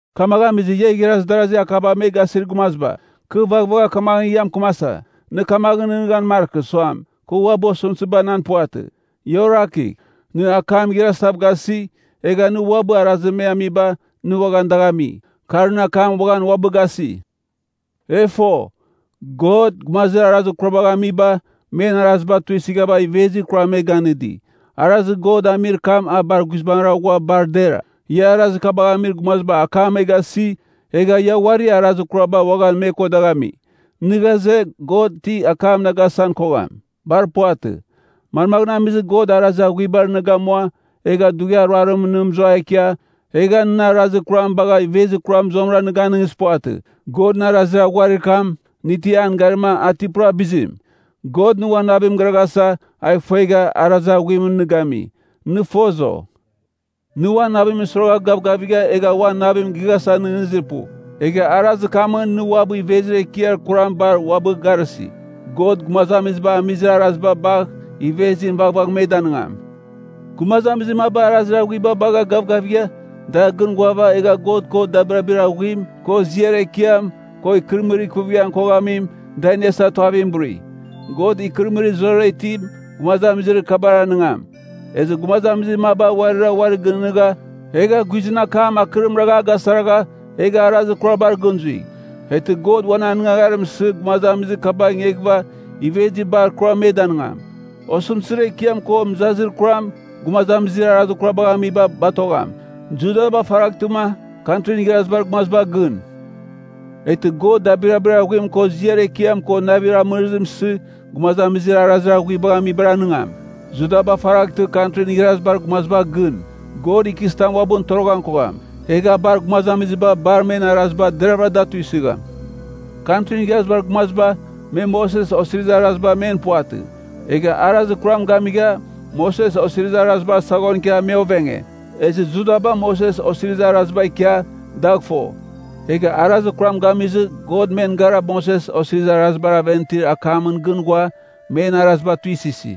Kamaghɨn amizɨ, ia igharaz darazi akaba me gasir gumaziba, kɨ vaghvagh kamaghɨn ia mɨkɨmasa, nɨ kamaghɨn nɨghnɨghan markɨ suam, kɨ uabɨ osɨmtɨziba nan puvatɨ. Ia orakigh, nɨ akam igharazitav gasi, egha nɨ uabɨ arazir me amiba nɨ uaghan dagh ami, kar nɨ akam uaghan uabɨ gasi. E fo, God, gumazir arazir kurar kabagh amiba, men araziba tuisɨgha ivezir kuram me ganɨdi, arazir God amir kam a bar guizbangɨra ghua bar dera. Ia arazir kabagh amir gumaziba akam me gasi, egha ia uari arazir kaba uaghan me ko dagh ami. Nɨ ghaze, God ti akam nɨ gasan kogham? Bar puvatɨ! Manmaghɨn amizɨ God arazir aghuibar nɨ gamua, egha dughiar ruarimɨn nɨ mɨzua ikia, egha nɨn arazir kuram bagha ivezir kuram zuamɨra nɨ ganɨngizir puvatɨ. Godɨn arazir aghuarir kam, nɨ ti an garima a ti pura bizim? God nɨ uan navim gɨraghasa a ifongegha, arazir aghuimɨn nɨ gami. Nɨ foz, o? Nɨ uan navimɨn suiragha gavgavigha egha uan navim gighasa nɨghnɨzir pu. Egha arazir kamɨn nɨ uabɨ ivezir ekiar kuram bar uabɨ garɨsi. God gumazamiziba amizir araziba bagh ivezim vaghvagh me danɨngam. Gumazamizir maba arazir aghuiba bagha gavgavigha dar gɨn ghuava, egha God ko dabirabir aghuim, ko ziar ekiam, ko ikɨrɨmɨrir ikuvighan koghamim, da iniasa tuavim buri. God ikɨrɨmɨrir zurazurara itim gumazamizir kabar anɨngam. Ezɨ gumazamizir maba uarira uari gɨnɨghnɨgha, egha guizɨn akam akɨrim ragh a gasaragha egha arazir kurabar gɨn zui. Eghtɨ God uan anɨngagharim isɨ gumazamizir kabagh ingeghɨva ivezir bar kuram me danɨngam. Osɨmtɨzir ekiam ko mɨzazir kuram gumazamizir arazir kurabagh amiba batogham. Judaba faraghtɨma Kantrin Igharazibar Gumaziba gɨn. Eghtɨ God dabirabir aghuim ko ziar ekiam ko navir amɨrɨzim isɨ gumazamizir arazir aghuibagh amibar anɨngam. Judaba faraghtɨ Kantrin Igharazibar Gumaziba gɨn. God ikɨzitam uabɨn toroghan kogham, egh a bar gumazamiziba bar men araziba deravɨra da tuisɨgham Kantrin Igharazibar Gumaziba, me Moses Osirizir Araziba men puvatɨ. Egha arazir kuram gamigha, Moses Osirizir Arazibar saghon ikia me ovenge. Ezɨ Judaba Moses Osirizir Araziba ikia dagh fo. Egha arazir kuram gamizɨ, God men gara Moses Osirizir Arazibar aven itir akamɨn gɨn ghua men araziba tuisɨsi.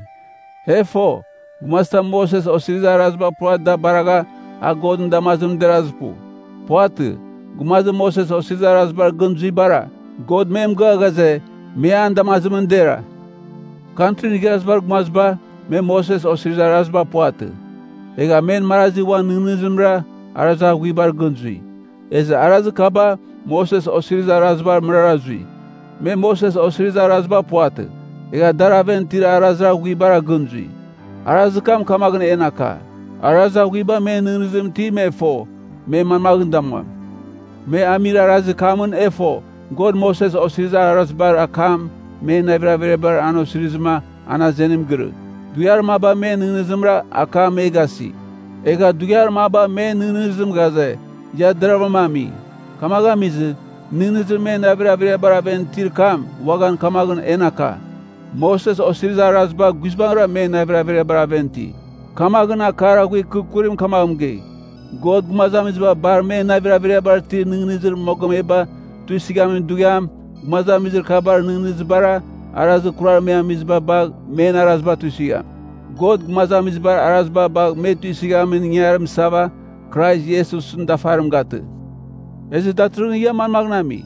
E fo, gumazitam Moses Osirizir Araziba pura da baragha, a Godɨn damazimɨn derazir pu. Puvatɨ. Gumazir Moses Osirizir Arazibar gɨn zuibara, God me mɨgɨa ghaze, me an damazimɨn dera. Kantrin Igharazibar Gumaziba, me Moses Osirizir Araziba puvatɨ. Egha men marazi uan nɨghnɨzimra arazir aghuibar gɨn zui, ezɨ arazir kaba Moses Osirizir Araziba mɨrara zui. Me Moses Osirizir Araziba puvatɨ, egha dar aven itir arazir aghuibar gɨn zui. Arazir kam kamaghɨn en aka, arazir aghuiba men nɨghnɨzimɨn iti me fo, me manmaghɨn damuam. Me amir arazir kamɨn e fo, God Moses Osirizir Arazibar akam men navir averiabar an osirizɨma an azenim girɨ. dughiar maba men nɨghnɨzimra akam me gasi; egha dughiar maba men nɨghnɨzim ghaze, ia deravɨram ami. Kamaghɨn amizɨ, nɨghnɨzir men navir averiabar aven itir kam uaghan kamaghɨn en aka, Moses Osirizir Araziba guizbangɨra men navir averiabar aven iti. Kamaghɨn, akar aghuir kɨ kurim kamaghɨn mɨgei, God gumazamiziba bar men navir averiabar itir nɨghnɨzir mogomeba tuisɨghamin dughiam, gumazamizir kabar nɨghnɨzibara arazir kurar me amiziba bagh men araziba tuisɨgham. God gumazamizibar araziba bagh me tuisɨghamin ingarim isava, Krais Iesusɨn dafarim gatɨ. Ezɨ datɨrɨghɨn ia manmaghɨn ami?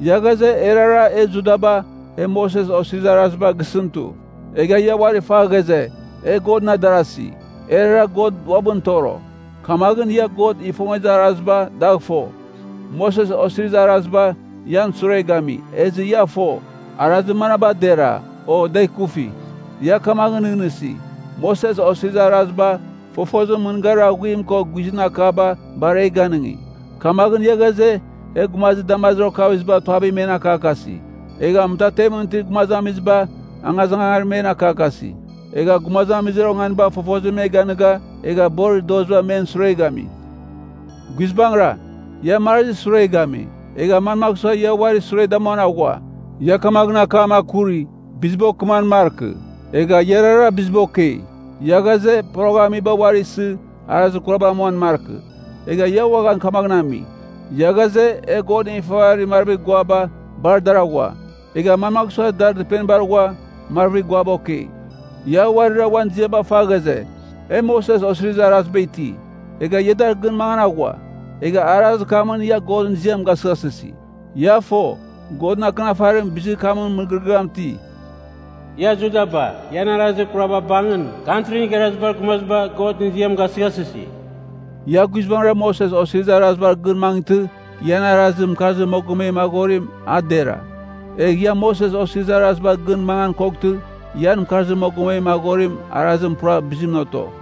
Ia ghaze, erara e Judaba; e Moses Osirizir Araziba gisɨn tu. Egha ia uari fa ghaze, e Godɨn adarasi, erara God uabɨn toro. Kamaghɨn ia God ifongezir araziba dagh fo. Moses Osirizir Araziba ian sure gami, ezɨ ia fo, arazir manaba dera, o da ikufi. Ia kamaghɨn nɨghnɨsi, Moses Osirizir Araziba fofozimɨn mɨngarir aghuim ko guizɨn akaba bar e ganɨngi. Kamaghɨn ia ghaze, e gumazir damazir okaviziba tuavim men akakasi. Egha mɨtatemɨn itir gumazamiziba, angazangarim men akakasi. Egha gumazamizir onganiba fofozim me ganɨga, egha borir doziba men sure gami. Guizbangɨra, ia marazir sure gami. Egha manmagh sua ia uari sure damuan aghua? Ia kamaghɨn akam akuri, biziba okɨman markɨ. Egha iarara biziba okei. Ia ghaze, poroghamiba uari isɨ arazir kurabar amuan markɨ. Egha ia uaghan kamaghɨn ami. Ia ghaze, e godɨn ifavarir marvir guaba, bar dar aghua. Egha manmagh sua dar dɨpenibar ghua, marvir guaba okei. Ia uarira uan ziaba fa ghaze, “E Moses Osirizir Araziba iti.” Egha ia dar gɨn mangan aghua. Egha arazir kamɨn ia Godɨn ziam gasɨghasɨsi. Ia fo, Godɨn Akɨnafarim bizir kamɨn mɨgɨrɨgɨam iti, “Ia Judaba, ian arazir kuraba bangɨn, Kantrin Igharazibar Gumaziba Godɨn ziam gasɨghasɨsi.” Ia guizbangɨra Moses Osirizir Arazibar gɨn mangɨtɨ, ian arazir mɨkarzir mogomem aghorim a dera. Egh ia Moses Osirizir Arazibar gɨn mangan koghtɨ, ian mɨkarzir mogomem aghorir arazim pura bizimɨn oto.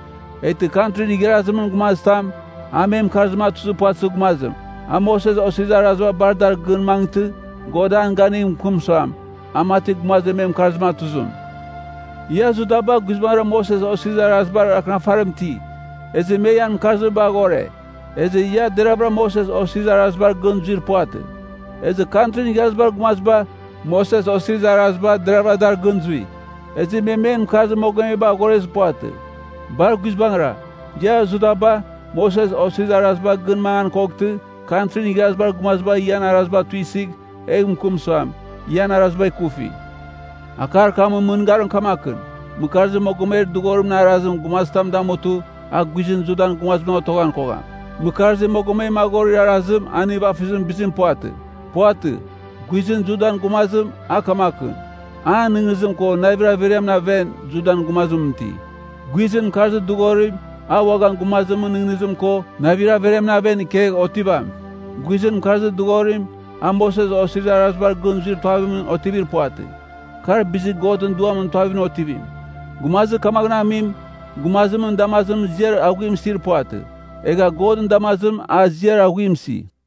Eghtɨ Kantrin Igharazimɨn Gumazitam, a me mɨkarzim atuzir puvatɨzir gumazim, a Moses Osirizir Araziba bar dar gɨn mangɨtɨ, God an ganigh mɨkɨm suam, a mati gumazir me mɨkarzim atuzim. Ia Judaba guizbangɨra Moses Osirizir Arazibar akɨnafarim iti, ezɨ me ian mɨkarziba aghore. Ezɨ ia deravɨra Moses Osirizir Arazibar gɨn zuir puvatɨ. Ezɨ Kantrin Igharazibar Gumaziba, Moses Osirizir Araziba deravɨra dar gɨn zui, ezɨ me men mɨkarzir mogomeba aghorezir puvatɨ. Bar guizbangɨra, ia Judaba, Moses Osirizir Araziba gɨn mangan koghtɨ, Kantrin Igharazibar Gumaziba ian araziba tuisɨgh egh mɨkɨm suam, ian araziba ikufi. Akar kamɨn mɨngarim kamakɨn: mɨkarzir mogomer dɨghorimɨn arazim gumazitam damutɨ, a guizɨn Judan gumazimɨn otoghan kogham. Mɨkarzir mogomem aghorir arazim a nivafɨzimɨn bizim puvatɨ. Puvatɨ. Guizɨn Judan gumazim a kamakɨn: an nɨghnɨzim ko navir averiamɨn aven Judan gumazimɨn iti. Guizɨn mɨkarzir dɨghorim, a uaghan gumazimɨn nɨghnɨzim ko navir averiamɨn aven ikegh otivam. Guizɨn mɨkarzir dɨghorim, a Moses Osirizir Arazibar gɨn zuir tuavimɨn otivir puvatɨ. Kar bizir Godɨn Duamɨn tuavimɨn otivim. Gumazir kamaghɨn amim, gumazimɨn damazimɨn ziar aghuim isir puvatɨ. Egha Godɨn damazimɨn a ziar aghuim isi.